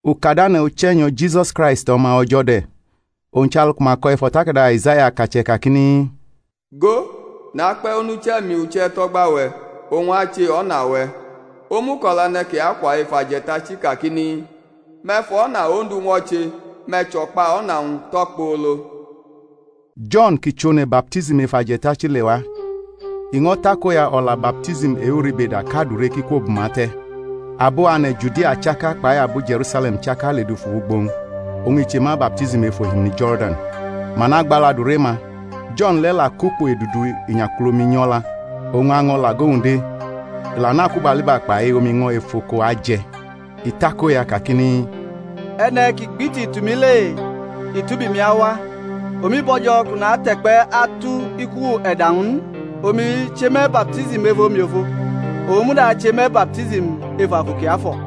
Ukadane̩ Uche̩nyo̩ Jisus Kraist O̩ma O̩jo̩ de̩. Owñ chʼalu ku ma ko̩ ef o̩takada Aizaya akache̩ kakini, Go, nakpe̩ onuche̩-mi uche̩ tʼo̩gba-we̩, owñ ache o̩na-we̩; omuko̩la e̩ne̩ kʼi akwa ef aje̩tachi kakini, Me̩ fʼo̩na Ondu ñwo̩che, me̩ chʼo̩kpa o̩na-wñ tʼokpolo. Jo̩n, kʼi chʼone̩ baptism ef aje̩tachi, lewa, i ño̩ takoya o̩la baptism e-uribeda kʼadure ki kwo bʼuma te̩. Abo ane̩ Judia chaka kpai abo Je̩rusale̩m chaka ledufu wʼugbo-wñ; oñ i che ma baptism ef ohimini Jo̩rdan, ma nagbalu adure-ma. Jo̩n le̩ la kʼukpo edudu inyakulumi nyʼo̩la, oñ año̩ lʼago-wñ de, i la nʼakubaliba kpai omiño̩ e-efoko aje̩. I takoya kakini, E̩ne̩ ki gbiti tʼumi le i tʼubi-mi awa, omi bo̩jo̩ kʼu nate̩kpe̩ atu iku e̩da-wñ n. Omi che me̩ baptism ef omiofo; owñ muda ache me̩ baptism ef Afu Kiafo̩.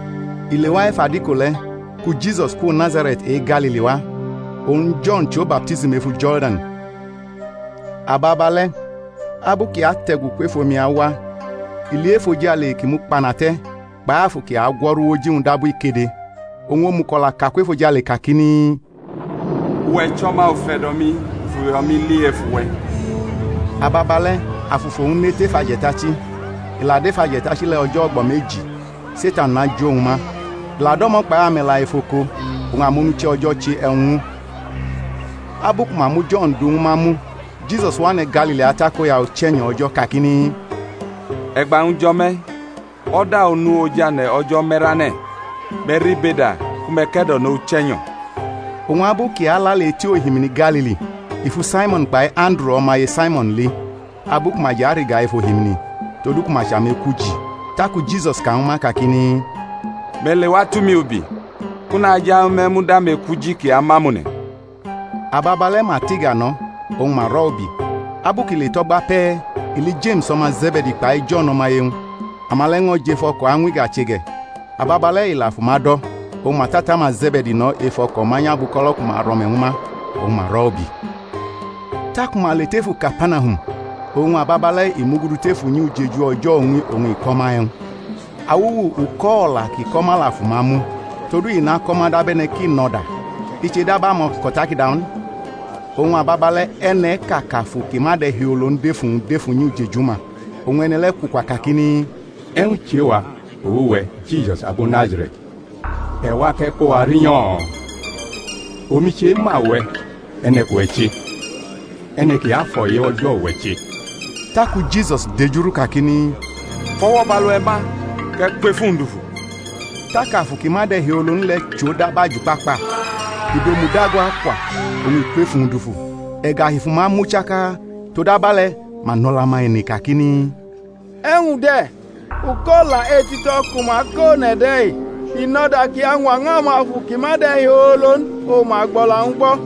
I lewa ef adiko le̩, ku Jisus kwo Nazare̩t e-Galili wa, oñ Jo̩n chʼo baptism efu Jo̩rdan. Ababale̩ abu kʼi ate̩gu kwef omi awa i li efojale ki mukpana te̩, kpai Afu kʼi agwo̩ru wʼoji-wñ dabu ikede; oñ omuko̩laʼka kwʼefojale kakini, Uwe̩ chʼO̩ma ufe̩do̩-mi, u fʼuyo̩-mi li ef uwe̩. Ababale̩ Afu fʼowñ ne tef aje̩tachi. I la dʼef aje̩tachi le̩ o̩jo̩ o̩gbo̩ meji, Setan najʼowñ ma; i la do̩mo̩ kpai ame̩la efoko; oñ amonuche̩ O̩jo̩ che e̩wñ ñw u. Abu ku ma mu Jo̩n du ñwu ma mu, Jisus wʼane̩ Galili atakoya Uche̩nyo̩ O̩jo̩, kakini, E̩gba-wñ jo̩ me̩, o̩da onu ojane̩ O̩jo̩ me̩rane̩; me̩ ribeda ku me̩ ke̩do̩no Uche̩nyo̩. Oñ abu kʼi alale eti ohimini Galili, i fu Saimo̩n kpai Anduru o̩maye Saimo̩n li, abu ku ma jʼariga ef ohimini; todu ku ma chʼamekwuji. Taku Jisus ka ñwu ma, kakini, Me̩ lewa tu mi ubi, kʼu naje̩ ñwu me̩ mud amekwuji ki amʼamone̩. Ababale̩ ma tʼiga no̩, oñ ma rʼo̩ ubi. Abu kʼi le tʼo̩gba pe̩, i li Jeme̩s o̩ma Ze̩be̩di kpai Jo̩n o̩maye-wñ, ama le̩ ño̩ jʼef o̩ko̩ añwʼiga che ge̩. Ababale̩ i la fʼuma do̩; oñ ma tʼata-ma Ze̩be̩di no̩ ef o̩ko̩ manyʼabuko̩lo̩ ku ma rʼo̩me̩ ñwu ma, oñ ma rʼo̩ ubi. Taku ma le tʼefu Kapanahum; oñ ababale̩ i mugudu tef unyi ujeju o̩jo̩ uñmi oñ i ko̩ ma e̩wñ. Awuwu uko̩-o̩la kʼi ko̩ ma la fʼuma mu: todu i nako̩ ma dab e̩ne̩ kʼi nʼo̩da, i che dab amako̩takada n. Oñ ababale̩ e̩ne̩ʼka kʼafu ki ma de̩hiolo n dʼef uwñ dʼef unyi ujeju-ma; oñ e̩ne̩ le̩ kwukwa, kakini, E̩wñ chʼe-wa kpʼuwe̩, Jisus abo Nazare̩t? E̩ wa kʼe̩ ko wa rinyo̩? Omi chema uwe̩, e̩ne̩ kʼuwe̩ che, E̩ne̩ Kiafo̩ e-O̩jo̩ uwe̩ che. Taku Jisus dejurʼu kakini, Fʼo̩wo̩ bʼalu-we̩ ma kʼe̩ kwʼef uwñ dufu. Tak afu ki ma de̩hiolo n le̩ chʼo dab ajukpakpa, i dʼomu dago akwa, oñ i kwʼef uwñ dufu. E̩gahi fʼuma mu chaka, todabe̩le̩ ma nʼo̩lo̩-ma ene kakini, E̩wñ de̩? Uko̩-o̩la etito̩ ku ma ko̩ one̩ de̩-i! I nʼo̩da kʼi añwa ñw amafu ki ma de̩hiolo n oñ ma gbʼo̩la-wñ gbo̩.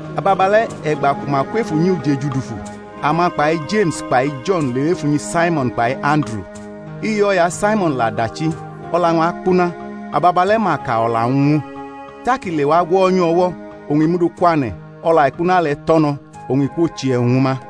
Ababale̩ e̩gba ku ma kwʼef unyi ujeju dufu, ama kpai Jeme̩s kpai Jo̩n lewʼef unyi Saimo̩n kpai Anduru. Iye o̩ya Saimo̩n la dachi, o̩la-wñ akpuna; ababale̩ ma ka o̩la-wñ ñw u. Tak i lewa gwo̩nyʼu o̩wo̩, oñ i mʼu du kwane̩; o̩la e̩kpuna le̩ tʼo̩ no, oñ i kwoche e̩wñ ñwu ma.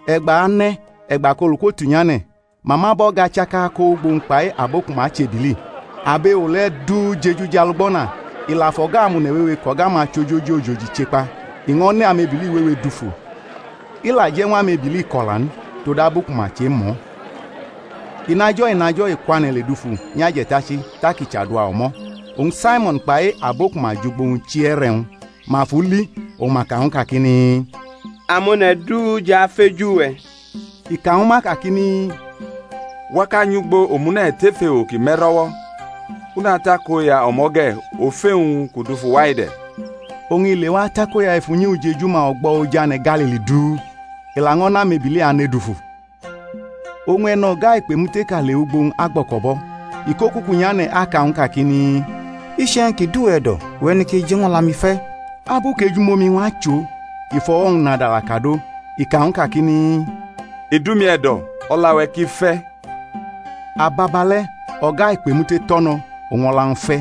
E̩gba ane̩ e̩gba kʼolu kwotunynʼane̩, ma mʼabo̩ga chaka ko wʼugbo-wñ kpai abo ku ma chʼebili. Abewo le̩ du jeju jʼalugbo̩na. I la fʼo̩ga amone̩ wewe kʼo̩ga-ma chʼojoji ojoji che kpa; i ño̩ ne amebili wewe dufu, i la je̩ ñw amebili ko̩la n, todabu ku ma chemʼo̩. Inajo̩-inajo̩ i kwane̩ ledufu nyʼaje̩tachi, tak i chadua o̩mo̩. Oñ Saimo̩n kpai abo ku ma jʼugbo-wñ chi e̩re̩-wñ. Ma fʼu li, oñ ma ka ñw u kakini, Amone̩ du jʼafeju we̩. I ka ñwu ma kakini, Wa kʼa nyʼugbo omune̩ tef ewo ki me̩ro̩wo̩, kʼu natakoya o̩mo̩ ge̩; ofe-wñ kʼu dufu wa-i de̩. Oñ i lewa atakoya ef unyi ujeju-ma o̩gbo̩ ojane̩ Galili du, i laño̩ nʼamebili ane dufu. Oñ e̩no̩ga-ikpemuteʼka lewʼugbo-wñ agbo̩ko̩bʼo̩, i kʼokuku nyane̩ aka ñw u kakini, Iche̩wñ ki dʼuwe̩ e̩do̩, uwe̩ neke je̩ ñw o̩la-mi fe̩. Abu kʼejumomi-wñ achʼo i fʼo̩wo̩-wñ nadala kadʼo, i ka ñw u kakini, I dʼumi e̩do̩; o̩la-we̩ ki fe̩. Ababale̩ o̩ga-ikpemute tʼo̩ no̩, oñ o̩la-wñ fe̩.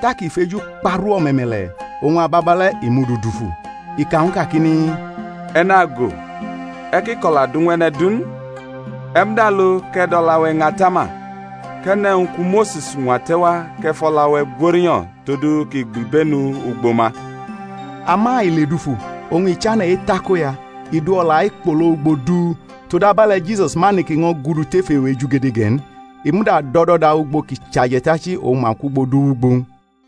Tak i fejukparʼu o̩me̩me̩le̩, oñ ababale̩ i mʼu du dufu, i ka ñw u, kakini, E̩ nago, e̩ ki ko̩la du ñw e̩ne̩ du n; e̩ muda lo, kʼe̩ dʼo̩la-we̩ ña atama, kʼe̩ ne̩ e̩wñ ku Mose̩s ñwa te̩ wa kʼe̩ fʼo̩la-we̩ gworinyo̩, todu kʼi gbibenu ugbo ma. Ama i ledufu oñ i chane̩ etakoya, i du o̩la-i kpogo ugbo du, todabe̩le̩ Jisus ma neke ño̩ gudu tef ewo ejugede ge̩ n, i muda dʼo̩do̩da ugbo kʼi chʼaje̩tachi, oñ ma kwʼugbo du wʼugbo-wñ.